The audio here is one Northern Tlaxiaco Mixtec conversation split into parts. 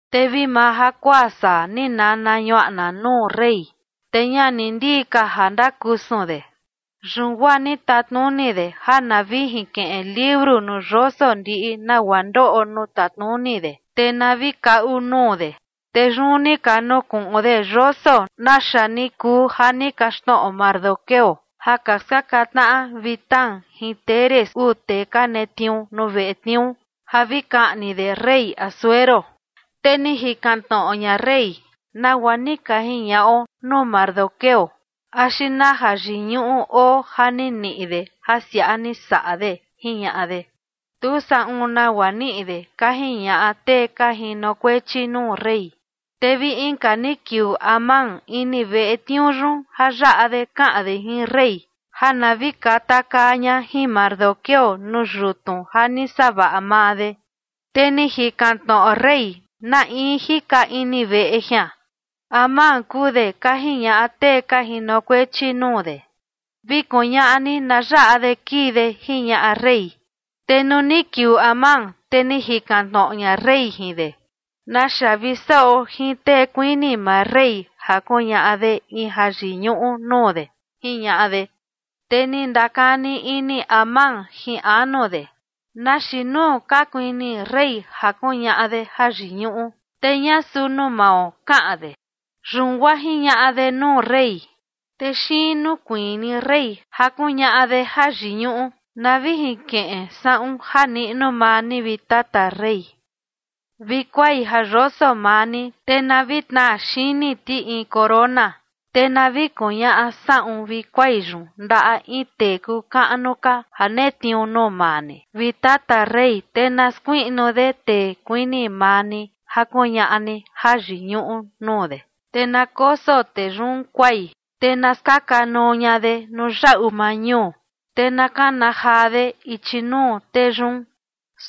Te vi maa jakuaa saa, ni nana ñuaꞌna nuu rey, te ña ni ndii ka ja ndakusun de. Yun guaa ni tatnuni de ja na vi jinkiꞌin liuru nuu yoso ndiꞌi nagua ndoꞌo nuu tatnuni de, te na vi kaꞌu nuu de. Te yun ni ka nukuꞌun de yoso naxa ni kuu ja ni kaxtnoꞌo Mardoqueo ja ka skaka tnaꞌa Bigtán jin Teres uu tee ka netniuu nuu veꞌe tniuu, ja vi kaꞌni de rey Asuero. Te ni jikan tnoꞌo ña rey: ―¿Nagua ni ka jiñaꞌo nuu Mardoqueo axi na jayiñuꞌu oo ja ni niꞌi de ja siaꞌa ni saꞌa de? ―jiñaꞌa de. ―Tu saꞌun nagua niꞌi de ―ka jiñaꞌa tee ka jinokuechi nuu rey. Te vi inka ni kiuu Amán ini veꞌe tniuu yun ja yaꞌa de kaꞌan de jin rey ja na vi katakaa ña jin Mardoqueo nuu yutnu ja ni savaꞌa maa de. Te ni jikan tnoꞌo rey: ―¿Na in jika ini veꞌe jian? ―Amán kuu de ―ka jiñaꞌa tee ka jinokuechi nuu de. ―Vi kuñaꞌa ni na yaꞌa de kii de ―jiñaꞌa rey. Te nuu ni kiuu Amán, te ni jikan tnoꞌo ña rey jin de: ―¿Naxa vi saꞌo jin tee kuini maa rey ja kuñaꞌa de in jayiñuꞌu nuu de? ―jiñaꞌa de. Te ni ndakani ini Amán jin anu de: “¿Na xiin nuu ka kuini rey ja kuñaꞌa de jayiñuꞌu, te ña suu nuu mao?”, kaꞌan de. Yun guaa jiñaꞌa de nuu rey: ―Tee xiin nuu kuini rey ja kuñaꞌa de jayiñuꞌu, na vi jinkiꞌin saꞌun ja niꞌnu maa ni, vi tata rey, vi kuai ja yoso maa ni, te na vi tnaa xini ti in corona. Te na vi kuñaꞌa saꞌun vi kuai yun ndaꞌa in tee kuu kaꞌnu ka ja netniuu nuu maa ni, vi tata rey, te na skuiꞌnu de tee kuini maa ni ja kuñaꞌa ni jayiñuꞌu nuu de. Te na koso tee yun kuai, te na skaka nuu ña de nuu yaꞌu maa ñuu, te na kana jaa de ichi nuu tee yun: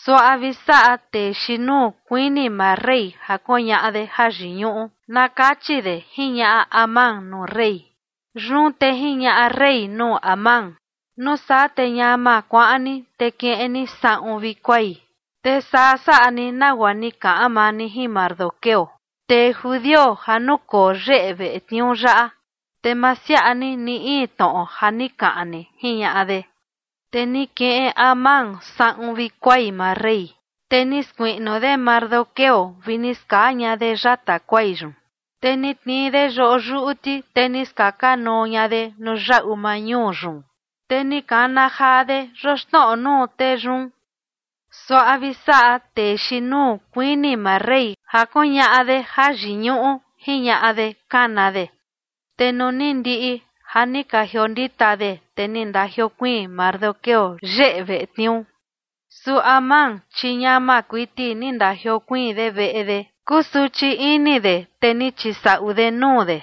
“Suaꞌa vi saꞌa tee xiin nuu kuini maa rey ja kuñaꞌa de jayiñuꞌu”, na kachi de ―jiñaꞌa Amán nuu rey. Yun te jiñaꞌa rey nuu Amán: ―Nuu saa te ñama kuaꞌan ni, te kiꞌin ni saꞌun vi kuai, te saa saꞌa ni, nagua ni kaꞌan maa ni jin Mardoqueo, tee judio ja nukoo yeꞌe veꞌe tniuu yaꞌa. Te ma siaꞌa ni, ni in tnoꞌo ja ni kaꞌan ni ―jiñaꞌa de. Te ni kiꞌin Amán saꞌun vi kuai maa rey, te ni skuiꞌnu de Mardoqueo vi ni skaa ña de yata kuai yun, te ni tnii de yoꞌo yuꞌu ti, te ni skaka nuu ña de nuu yaꞌu maa ñuu yun, te ni kana jaa de yoxnoꞌo de nuu tee yun: “Suaꞌa vi saꞌa tee xiin nuu kuini maa rey ja kuñaꞌa de jayiñuꞌu”, jiñaꞌa de kana de. Te nuu ni ndiꞌi ja ni ka jiondita de, te ni ndajiokuiin Mardoqueo yeꞌe veꞌe tniuu. Su Amán, chi ñama kuiti ni ndajiokuiin de veꞌe de, kusuchi ini de, te ni chisaꞌu de nuu de.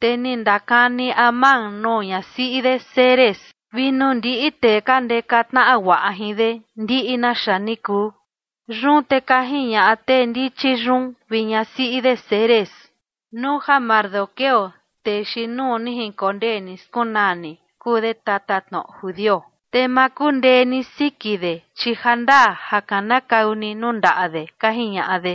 Te ni ndakani Amán nuu ñasiꞌi de Zeres vi nuu ndiꞌi tee ka ndeka tnaꞌa guaꞌa jin de ndiꞌi naxa ni kuu. Yun te ka jiñaꞌa tee ndichi yun vi ñasiꞌi de Zeres: ―Nuu ja Mardoqueo, tee xiin nuu ni jinkondee ni skunaa ni, kuu de tatatnoꞌo judio, te ma kundee ni siki de, chi jandaa ja kanakau ni nuu ndaꞌa de ―ka jiñaꞌa de.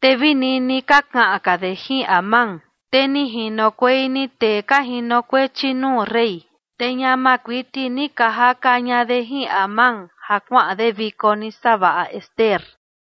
Te vi nini ka kaꞌan ka de jin Amán, te ni jinokuei ni tee ka jinokuechi nuu rey, te ñama kuiti ni ka jaka ña de jin Amán ja kuaꞌan de viko ni savaꞌa Ester.